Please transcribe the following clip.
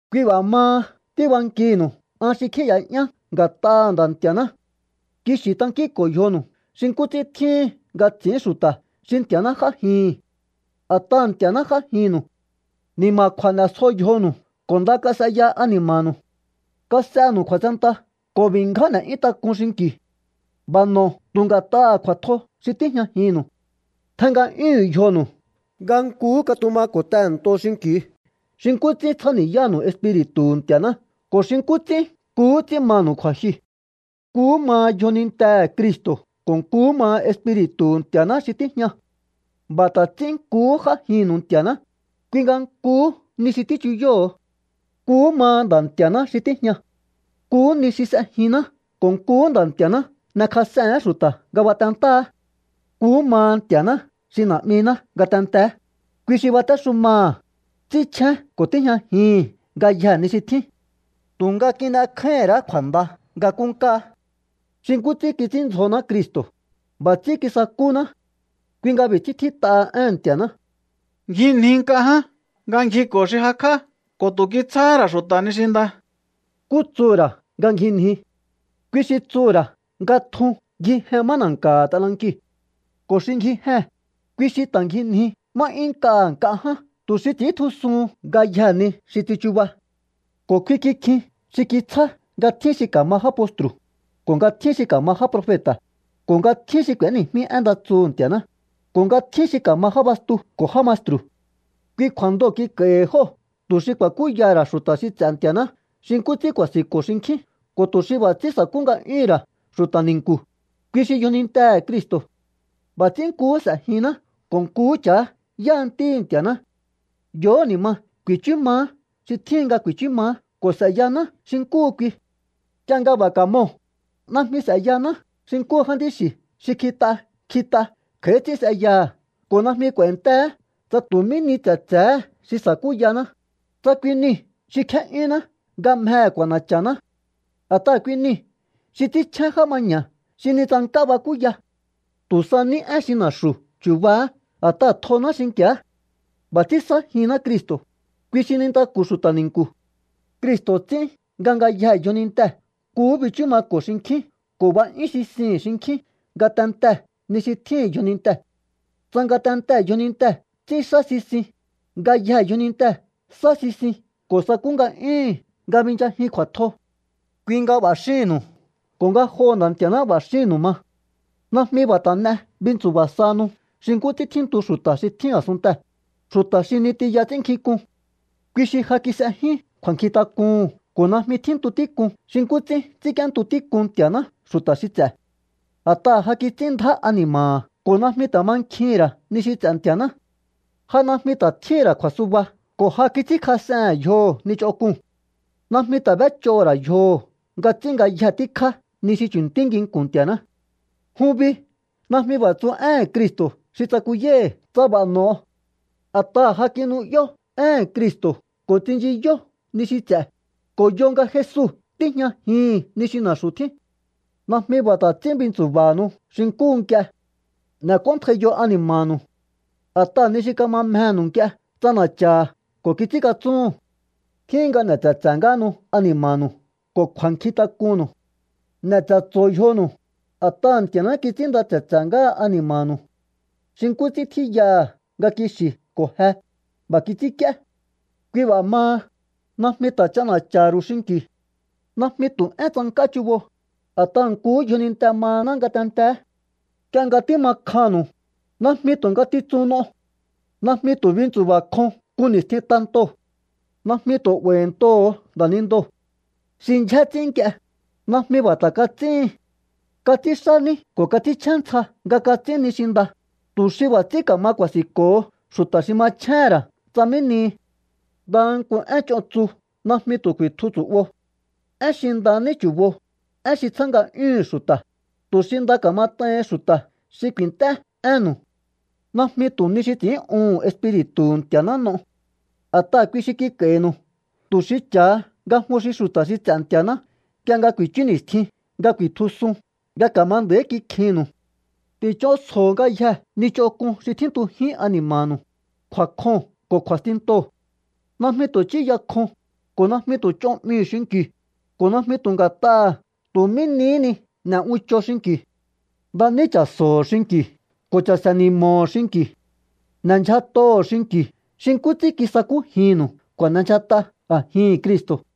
Kui b'a̱ maha tíbankihi̱nu̱u an xi kjíi̱ya'yán nga̱t'aha̱ Nda̱ Nti̱a̱ná. Kixi̱ tankínko̱o yjonu̱u xi nkú ts'ín tjíhin nga ts'i̱ín xu̱ta̱ xi Nti̱a̱ná j'ájihi̱n. A̱t'aha̱ Nti̱a̱ná j'ájinnu̱u. Ni̱ma̱kju̱a̱ n'e̱sjo yjonu̱u ko̱ nda kas'eya ani̱ma̱nu̱u. Kas'enu̱u kju̱a̱tsenta ko̱ b'i̱ ngján n'e̱'yún tak'un xinki̱u. B'a̱ n'o̱o tu̱ nga̱t'aha̱ kju̱a̱tjo xi tíjñajinnu̱u. Tjen nga'yúhu̱un yjonu̱u nga nkuhú katumako̱ tehe̱nto xinki̱u xi nkú ts'ín tsjáni̱yánu̱u Espiri̱tu̱hu̱ Nti̱a̱ná ko̱ xi nkú ts'ín nkuhú ts'ín manu̱u kju̱a̱jyuu̱. Nkuhú maha yjonintehe̱ Cristo̱ ko̱ nkuhú maha Espiri̱tu̱hu̱ Nti̱a̱ná xi tíjña. B'a̱ ta̱ ts'ín nkuhú j'ájinnu̱u Nti̱a̱ná, kui nga nkuhú ni xi tíchuyóho̱o. Nkuhú maha Nda̱ Nti̱a̱ xi tíjña. Nkuhú ni xi s'ejinná ko̱ nkuhú Nda̱ Nti̱a̱ná n'ekjas'ehe̱én xu̱ta̱ nga batentáha̱á. Nkuhú maha Nti̱a̱ná xi Na̱'miná ngatenteé, kui xi batéxumaha̱, ts'ínchjén ko̱ tíjñajihi̱n ngayjee̱ ni xi tjín. Tu̱nga kin'ekjáíhín ra̱á kju̱a̱nda nga nkúnkáá. Xi nkú ts'ín kits'índzjoná Cristo̱, b'a̱ ts'ín kisakúná. Kui nga b'i̱ ts'ín tjít'aha éhe̱n Nti̱a̱ná: Ngjinji nk'a ján nga ngjiko̱ xi jakj'á, ko̱ tu̱ kitsjáhá ra̱ xu̱ta̱ ni xi nda. ¿Nkú tsuhu̱ ra̱ nga ngjinji? Kui xi tsuhu̱ ra̱ nga tjun ngjijen má na̱nka̱ha̱ t'anankiu̱. Ko̱ xi ngjijee̱n, kui xi ta̱ ngjinji má 'yún nk'aha̱ nk'a ján tu̱ xi ts'i̱íntjusuhun ngayjee̱ ni xi tsichuba. Ko̱ kui kikjin xi kitsjá nga tjín xi ka̱ma já postru̱, ko̱ nga tjín xi ka̱ma já profeta̱, ko̱ nga tjín xi k'u̱éni̱jmí én nda tsuhu̱ Nti̱a̱ná, ko̱ nga tjín xi ka̱ma já bastuu̱ ko̱ já maestru̱. Kui kju̱a̱ndoo̱ kik'a̱i̱hi̱ jóo̱ tu̱ xi ku̱a̱kúyaha̱ ra̱ xu̱ta̱ xi ts'e̱ Nti̱a̱ná xi nkú ts'ín ku̱a̱si̱nko̱ xinkjín ko̱ tu̱ xi b'a̱ ts'ín sa̱kú nga'yúhu̱n ra̱ xu̱ta̱ ni̱nku̱, kui xi yjonintehe̱ Cristo̱. B'a̱ ts'ín nkuhú s'e̱jihinná ko̱ nkuhú cha̱á yáha Ntíhi̱ Nti̱a̱ná. Yo̱hó ni̱ ma ku̱i̱chú maá xi tjíhin nga ku̱i̱chú maá ko̱ s'e̱yaná xi nkúhu kui. Nk'ie nga b'a̱ kamoo̱, najmi s'e̱yaná xi nkúhu jántí xi̱ xi kjit'a kjit'a kj'a̱í ts'ín s'eyaha̱ ko̱ najmi k'u̱a̱i̱nteé tsa tu̱ mí ni tse̱tse̱hé xi sa̱kúyaná, tsa kui niu̱ xi kjé'yúnná nga mjehe̱ k'u̱a̱na̱cha̱ná. A̱t'aha̱ kui niu̱ xi ts'ínchjén já maña̱ xi ni tsank'á bakúya. Tu̱ sa ní én xi na̱xu̱ chu̱ba̱á a̱t'aha̱ tjoná xi̱nki̱á. B'a̱ ts'ín sájihinná Cristo̱, kui xi nintaku̱ xu̱ta̱ ni̱nku̱. Cristo̱ ts'ín nga ngayjee̱ yjonintee̱ nkuhú bichú mako̱ xinkjín ko̱ b'a'yún sisihi̱n xinkjín ngatentee̱ ni xi tjíhi̱n yjonintee̱. Tsa ngatentee̱ yjonintee̱ ts'ínxá sisin, ngayjee̱ yjonintee̱ sá sisin ko̱ sakú nga'yúhu̱n nga binchajin kju̱a̱tjo. Kui nga b'a̱ xíhi̱nnu̱u ko̱ ngajoho̱ Nda̱ Nti̱a̱ná b'a̱ xíhi̱nu̱u ma. Najmi b'a̱ ta̱ n'e bintsu̱ba̱ sahanu xi nkú ts'ín tjíntu xu̱ta̱ xi tjín a̱sunntee̱, xu̱ta̱ xi ni tiya ts'ínnkjink'un. Kui xi ja kis'ejyún kju̱a̱nkjintak'uhu̱n ko̱ najmi tjíntu tík'un xi nkú ts'ín ts'ínk'íéntu tík'un Nti̱a̱ná xu̱ta̱ xi ts'e̱. A̱t'aha̱ ja kits'ín ndjá ani̱ma̱ha̱ ko̱ najmi ta̱ mankjihi̱n ra̱ ni xi ts'e̱ Nti̱a̱ná. Ja najmi ta̱ tjíhi̱n ra̱ kju̱a̱suba ko̱ ja kits'ínkjas'ehe̱n yjoho̱ ni ch'onk'uu̱n. Najmi ta̱ b'éch'oho̱ ra̱ yjoho̱ nga ts'ín ngayje tíkjá ni xi chu̱ntí nginku̱n Nti̱a̱ná. Jun bi najmi b'a̱ tsu éhe̱n Cristo̱ xi tsakuyái̱hi̱ tsa b'a̱ no̱o. A̱t'aha̱ ja kinu'yó éhe̱n Cristo̱ ko̱ tsinchiyó ni xi ts'e̱, ko̱ yo nga Jesu tíjñajihi̱n ni xi na̱xu̱ tjín. Najmi b'a̱ ta̱ ts'ín bintsu̱ba̱hanu xi nkúhu nk'ie. N'e̱k'óntjaiyo ani̱ma̱nu̱u. A̱t'aha̱ ni xi kama mjenu̱u nk'ie ts'ana̱cha̱ha̱ ko̱ kits'ínkatsúhu̱n. Tjíhin nga n'e̱ tse̱tse̱ ngáhanu ani̱ma̱nu̱u ko̱ kju̱a̱nkjintak'unnu̱u. N'e̱ tse̱tso̱o yjonu̱u, a̱t'aha̱ Nti̱a̱ná kits'ínnda tse̱tse̱ ngáha ani̱ma̱nu̱u. Xi nkú ts'ín tjíyaha̱ nga kixi̱ ko̱ je, b'a̱ kits'ínk'íé. Kui b'a̱ maha, najmi ta̱ ch'ana̱cha̱ha̱ ru̱u xinki̱u. Najmi tu̱ én tsank'á chubo, a̱t'aha̱ nkuhú yjoninte mahaná ngatenteé. Nk'ie nga tíma kjannu̱u, najmi tu̱ ngatitsun n'o. Najmi tu̱ bintsu̱ba̱ kjon nku ni̱stjin tantoo̱. Najmi tu̱ 'ba̱i̱ntoho̱o nda̱nindoo̱. Xi ndyjé ts'ín nk'ie, najmi b'a̱ ta̱ kats'íhin. Kats'ínxá ní ko̱ kats'ínchjén ntsja nga kats'ín ni xi nda, tu̱ xi b'a̱ ts'ín ka̱ma ku̱a̱si̱nko̱ho xu̱ta̱ xi machjéhe̱n ra̱ tsa mí nihi. Ndaha nku én ch'on tsu najmi tu̱ ku̱i̱tju tsu̱'bo. Én xi nda ní chu̱bo, én xi tsjá nga'yúhu̱n xu̱ta̱, tu̱ xi nda ka̱mat'aihin xu̱ta̱ xi ku̱i̱nt'é énnu̱u. Najmi tu̱ ni xi ts'i̱ín'uhu̱n Espiri̱tu̱hu̱ Nti̱a̱ná n'o. A̱t'aha̱ kui xi kik'a̱i̱nu̱u tu̱ xi cha̱ha nga jun xi xu̱ta̱ xi ts'e̱ Nti̱a̱ná nk'ie nga ku̱i̱chú ni̱stjin nga ku̱i̱tjusun nga ka̱ma nda̱í kikjinnu̱u. Ti̱ch'onsjo̱o ngayjee̱ ni ch'onk'un xi tjíntujín ani̱ma̱nu̱u, kju̱a̱kjoo̱n ko̱ kju̱a̱stintoo̱. Najmi tu̱ ch'íya kjon, ko̱ najmi tu̱ ch'on 'mihi̱u xinki̱u, ko̱ najmi tu̱ nga̱t'aha̱ tu̱ mí nihí ni n'e̱ uncho xinki̱u. Nda ní cha̱so̱ho̱ xinki̱u ko̱ cha̱se̱ni̱mo̱ho̱ xinki̱u. N'e̱ ndyjat'oho̱o xinki̱u xi nkú ts'ín kisakújinnu̱u kju̱a̱n'endyjat'a a̱jihi̱n Cristo̱.